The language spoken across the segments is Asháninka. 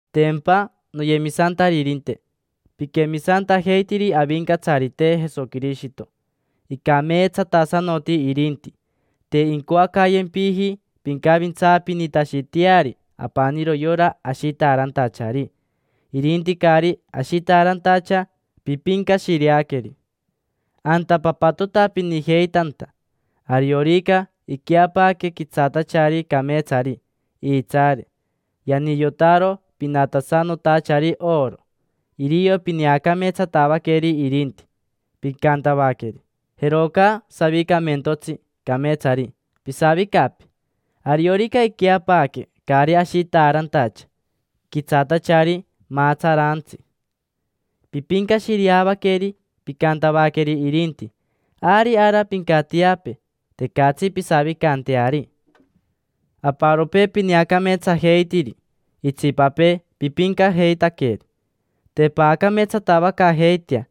Tempa, noyemisantaririnte, piquemisantajeitiri Avincatsarite Jesoquirishito. Icameetsatasanoti irinti. Te incoacayempiji pincavintsaapinitashiteari apaniro yora ashitaarantachari, irinti caari ashitaarantacha pipincashireaqueri. Anta papatotapinijeitanta: ariorica iqueapaaque quitsaatachari cameetsari iitsaare, yaniyotaro pinatasanotachari oro. Irio pineacameetsatavaqueri irinti, picantavaqueri: “Jeroca savicamentotsi cameetsari, pisavicapee”. Ariorica iqueapaaque caari ashitaarantacha, quitsaatachari maatsaraantsi, pipincashireavaqueri, picantavaqueri irinti: “Ari ara pincatiapee. Tecatsi pisavicanteari”. Aparopee pineacameetsajeitiri, itsipapee pipincajeitaqueri. Te paacameetsatavacaajeitea: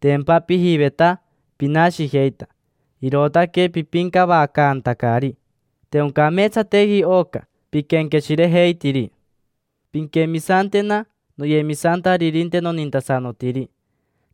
tempa pijiveta pinashijeita, irootaque pipincavacaantacari. Te oncameetsateji oca piquenqueshirejeitiri. Pinquemisantena, noyemisantaririnte nonintasanotiri.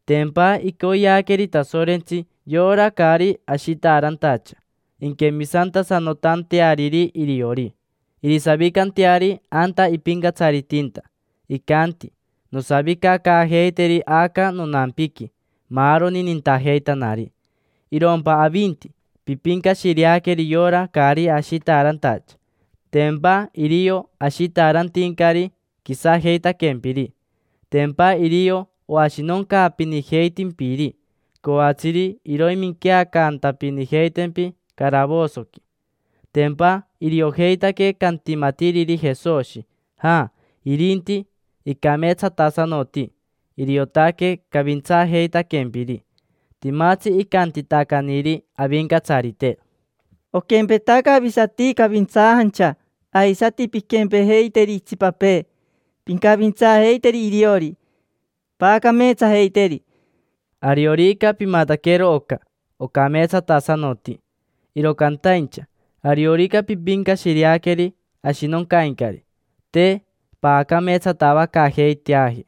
Tempa icoyeaqueri Tasorentsi yora caari ashitaarantacha inquemisantasanotanteariri iriori, irisavicanteari anta ipincatsaritinta. Icanti: “Nosavicacaajeiteri aca nonampiqui maaroni nintajeitanari”. Irompa avinti, pipincashireaqueri yora caari ashitaarantacha. Tempa irio ashitaarantincari quisajeitaquempiri. Tempa irio oashinoncaapinijeitimpiri, coatsiri iroiminqueacantapinijeitempi caravosoqui. Tempa iriojeitaque cantimatiriri Jesoshi. Ja, irinti, icameetsatasanoti, iriotaque cavintsaajeitaquempiri. Timatsi icantitacaniri Avincatsarite: “Oquempetaca avisati cavintsaajancha, aisati pinquempejeiteri itsipapee, pincavintsaajeiteri iriori, paacameetsajeiteri”. Ariorica pimataquero oca, ocameetsatasanoti. Iro cantaincha ariorica pipincashireaqueri ashinoncaincari, te paacameetsatavacaajeiteaji: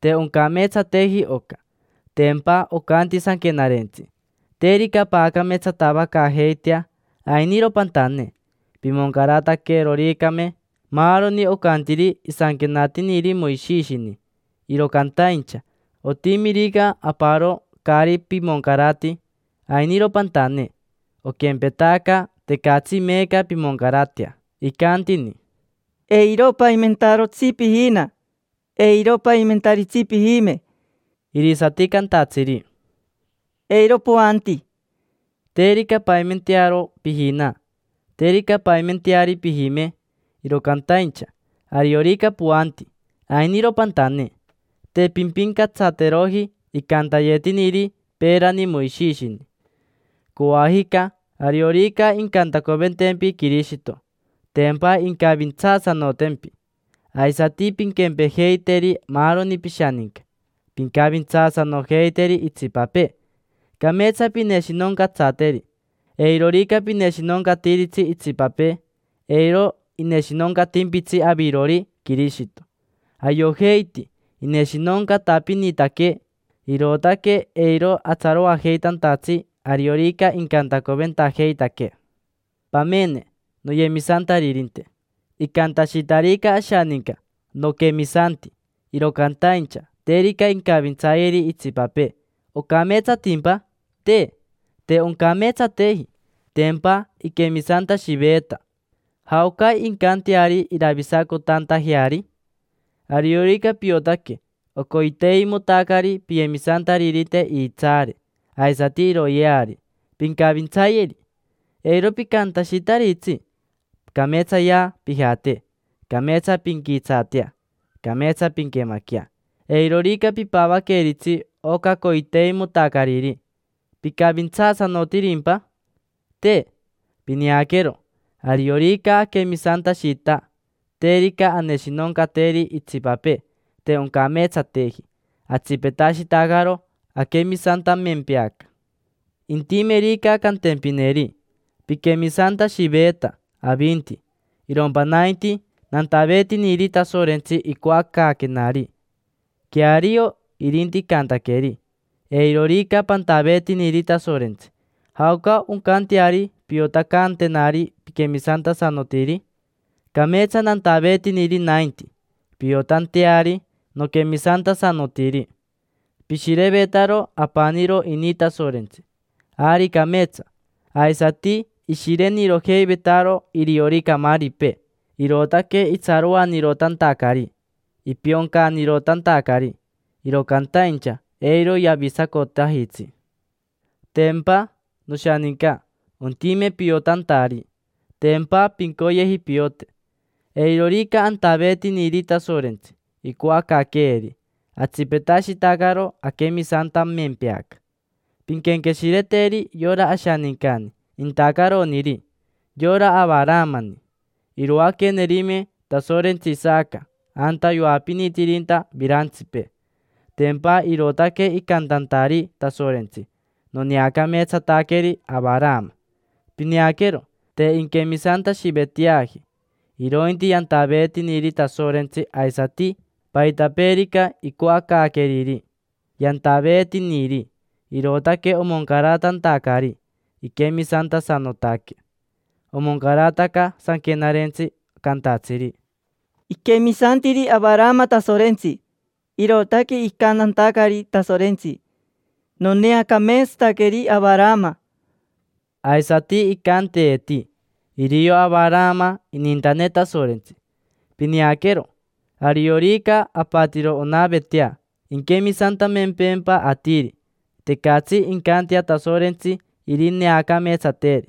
te oncameetsateji oca. Tempa ocanti Sanquenarentsi: “Terica paacameetsatavacaajeitea, ainiro pantane”. Pimoncarataqueroricame maaroni ocantiri isanquenatiniri Moishishini, iro cantaincha otimirica aparo caari pimoncarati, ainiro pantane: oquempetaca tecatsi meeca pimoncaratea. Icantini: “Eiro paimentarotsi pijina. Eiro paimentaritsi pijime”. Irisati cantatsiri: “Eiro poanti”. Terica paimentearo pijina, terica paimenteari pijime, iro cantaincha ariorica poanti, ainiro pantane: te pimpincatsateroji icantayetiniri peerani Moishishini. Coajica, ariorica incantacoventempi Quirishito, tempa incavintsaasanotempi. Aisati pinquempejeiteri maaroni pishaninca: pincavintsaasanojeiteri itsipapee, cameetsa pineshinoncatsateri. Eirorica pineshinoncatiritsi itsipapee, eiro ineshinoncatimpitsi avirori Quirishito. Ayojeiti ineshinoncatapinitaquee, irootaque eiro atsaroajeitantatsi ariorica incantacoventajeitaquee. Pamene, noyemisantaririnte: icantashitarica ashaninca: “Noquemisanti”, iro cantaincha terica incavintsayeri itsipapee, ¿ocameetsatimpa? Te, te oncameetsateji. Tempa iquemisantashiveeta: ¿jaoca incanteari iravisacotantajeari? Ariorica piotaque ocoiteimotacari piyemisantaririnte iitsaare aisati iroyeari, pincavintsayeri. Eiro picantashitaritsi: “Cameetsayea pijate. Cameetsa pinquitsaatea. Cameetsa pinquemaquea”. Eirorica pipavaqueritsi oca coiteimotacariri, ¿picavintsaasanotirimpa? Te. Pineaquero, ariorica aquemisantashita, terica aneshinoncateri itsipapee, te oncameetsateji: atsipetashitacaro aquemisantamempeaca. Intimerica cantempineri: “Piquemisantashiveeta avinti; irompa nainti, nantaveetiniri Tasorentsi icoacaaquenari”. Queario irinti icantaqueri. Eirorica pantaveetiniri Tasorentsi, ¿jaoca oncanteari piotacantenari piquemisantasanotiri? Cameetsa nantaveetiniri nainti, piotanteari noquemisantasanotiri. Pishirevetaro apaniro ini Tasorentsi, ari cameetsa. Aisati ishirenirojeivetaro iriori camaaripee, irootaque itsaroanirotantacari, ipioncanirotantacari; iro cantaincha eiro yavisacotajitsi. Tempa, noshaninca, ontime piotantari. Tempa pincoyeji piote. Eirorica antaveetiniri Tasorentsi icoacaaqueeri, atsipetashitacaro aquemisantamempeaca. Pinquenqueshireteri yora ashanincani intacaroniri: yora Avaramani. Iroaquenerime Tasorentsi Isaca anta yoapinitinirinta virantsipee. Tempa irootaque icantantari Tasorentsi: “Noneacameetsataqueri Avarama”. Pineaquero, te inquemisantashiveteaji, irointi yantaveetiniri Tasorentsi aisati paitapeerica icoacaaqueriri. Yantaveetiniri, irootaque omoncaratantacari iquemisantasanotaque. Omoncarataca sanquenarentsi, cantatsiri: “Iquemisantiri Avarama Tasorentsi, irootaque icantantacari Tasorentsi: ‘Noneacameetsataqueri Avarama’”. Aisati icanteeti: “Irio Avarama inintane Tasorentsi”. Pineaquero. Ariorica apatiro onavetea inquemisantamempeempa atiri, tecatsi incantea Tasorentsi irineacameetsateri.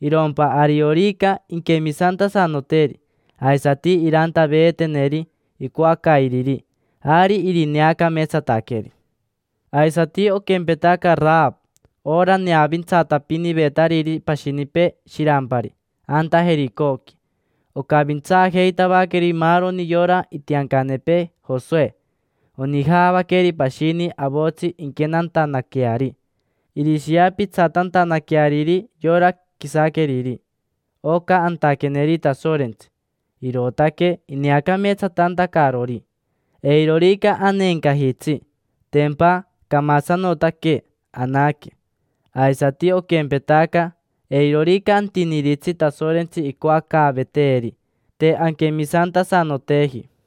Irompa ariorica inquemisantasanoteri aisati irantaveeteneri icoacairiri, ari irineacameetsataqueri. Aisati oquempetaca Arava: ora neavintsatapinivetariri pashinipee shirampari anta Jericoqui. Ocavintsaajeitavaqueri maaroni yora itiancanepee Josoe. Onijavaqueri pashini avotsi inquenantanaqueari irishiapitsatantanaqueariri yora quisaqueriri. Oca antaqueneri Tasorentsi, irootaque ineacameetsatantacarori. Eirorica aneencajitsi, tempa camasanotaquee anaque; aisati oquempetaca, eirorica antiniritsi Tasorentsi icoacaaveteeri, te anquemisantasanoteji.